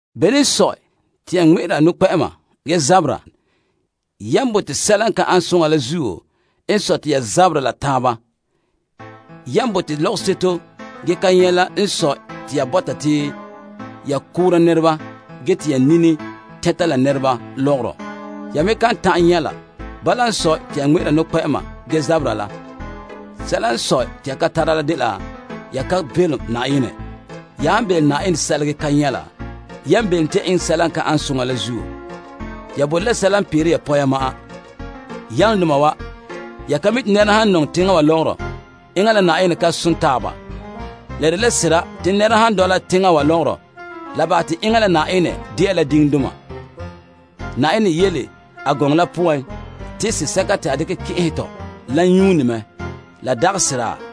Bene n sɔe te ya ŋmɛ'ɛra nɔkpɛ'ɛma ge zabera? Yan bote sɛla n ka ane soŋa la zuo n sɔe te ya zabera la taaba. Yan bote lɔgɔseto ge ka nyɛ' la n sɔe te ya bɔta te ya koora nɛreba ge te ya nini tɛnta la nɛreba lɔgɔrɔ. Ya me kan ta'an nyɛ' la. Bala n sɔe, te ya ŋmɛ'ɛra nɔkpɛ'ɛma ge zabera la. Sɛla n sɔe te ya ka tara la dela ya ka belom Na'ayenɛ. Ya han belom Na'ayenɛ sɛla ge ka nyɛ' la, yan belom te ya eŋɛ sɛla la n ka ane soŋa. Ya bote la sɛla n peere ya poya ma'an. Yalomdoma wa! Ya ka mi' te nɛra han nɔŋɛ teŋa wa lɔgɔrɔ, enŋa la Na'ayenɛ ka som taaba. La dela sera te nɛra han dɔla teŋa wa lɔgɔrɔ la bahɛ te enŋa la Na'ayenɛ dela diŋdoma. Na'ayenɛ yele a gɔŋɔ la poan te Sea sɛka te a dekɛ kɛn'ɛhɛ tɔ la yuune mɛ. La dagɛ sera?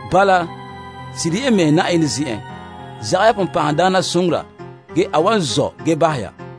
Bala, sirihe ya mɛhe Na'ayenɛ zen'en. Zagahɛ ya sagona la ge a wan zɔ' ge bahɛ ya.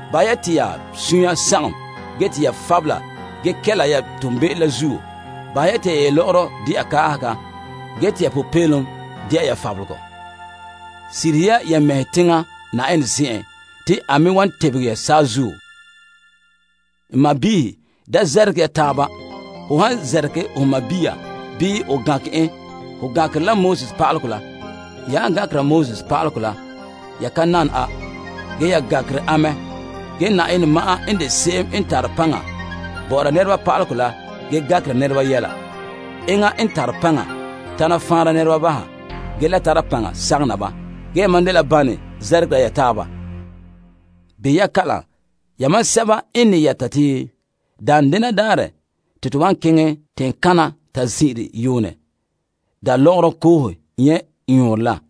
Bahɛ ya te ya suunre sagom ge te ya fabela ge kɛla ya toonbe'ero la zuo. Bahɛ ya te ya yelɔ'ɔrɔ dɛna kaahega ge te ya popeelom de'a ya fabelegɔ. Sirihe ya ya mɛhe teŋa Na'ayenɛ zen'en te a me wan tebege ya saazuo. N sɔɔnrɔ, da zɛrɛgerɛ ya taaba. Ho han zɛrɛgerɛ ho sɔɔn bii ho gankɛ en, ho gankerɛ pa'alegɔ la. Ya han gankera pa'alegɔ la, ya ka nana a, ge ya gankere a mɛ. Ge Na'ayenɛ ma'an n de se'em n tare paŋa bɔ'ɔra nɛreba pa'alegɔ la ge gankera nɛreba yɛla. Enŋa n tare paŋa tana faanra nɛreba baha ge le tara paŋa sagom na ba. Gee yamam dela bane zɛrɛgera ya taaba. Behɛ ya kalam, yamam sɛba n ne yɛta te daanden daarɛ ya wan keŋɛ teŋkana ta zin'ire yuunɛ da' lɔgɔrɔ koohe nyɛ' yɔɔrɔ la.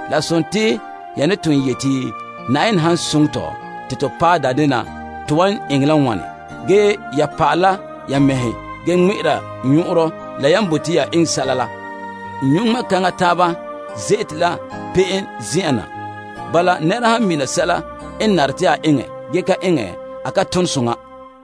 La sontii ya ne ton yeti, Na'ayenɛ han soŋɛ tɔ, te to paɛ daan denɛ to wan eŋɛ la bala bii bala. Ge ya pa'alɛ la ya mɛhe ge ŋmɛ'ɛra nyɔn'ɔnrɔ la yan bote ya eŋɛ sɛla la. Nyɔ' ŋmɛ' kaŋa taaba dela be'em zen'en na. Bala, nɛra han mina sɛla n nare te a eŋɛ ge ka eŋɛ, a ka ton soŋa.